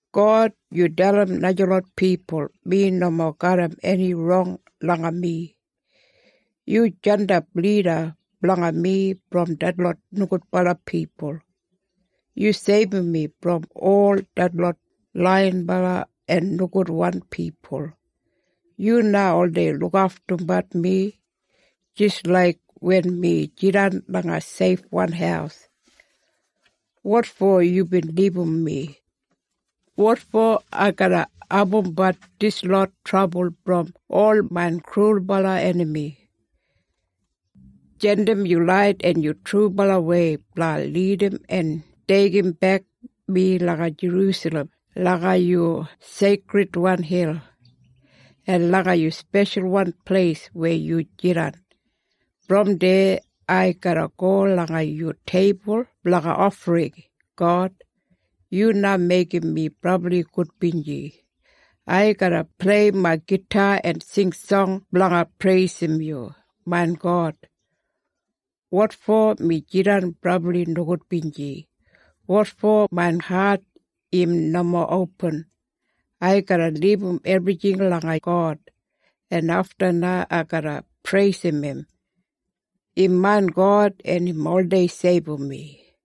God, yu dalim najalot pipul mi nomo garram eni rong langa mi. Yu jandap lida blanga mi brom detlot nogudbala pipul. Yu seibum mi brom ol detlot laiyinbala en nogudwan pipul. Yu na oldei lukaftumbat mi jis laik wen mi jidan langa seifwan haus. Wotfo yubin libum mi? Wotfo ai garra abumbat dislot trabul brom ol main krulbala enami? Jandim yu lait en yu trubalawei blanga lidim en deigimbek mi langa Jerusalem langa yu seikridwan hil, en langa yu speshalwan pleis weya yu jidan. Brom deya ai garra go langa yu teibul blanga ofring, God. Yu na meigim mi brabli gudbinji. Ai garra plei main gita en sing song blanga preisim yu, main God. Wotfo mi jidan brabli nogudbinji? Wotfo main hat im nomo opin? Ai garra libum ebrijing langa God, en afta na ai garra preisim im. Im main God, en im oldei seibum mi.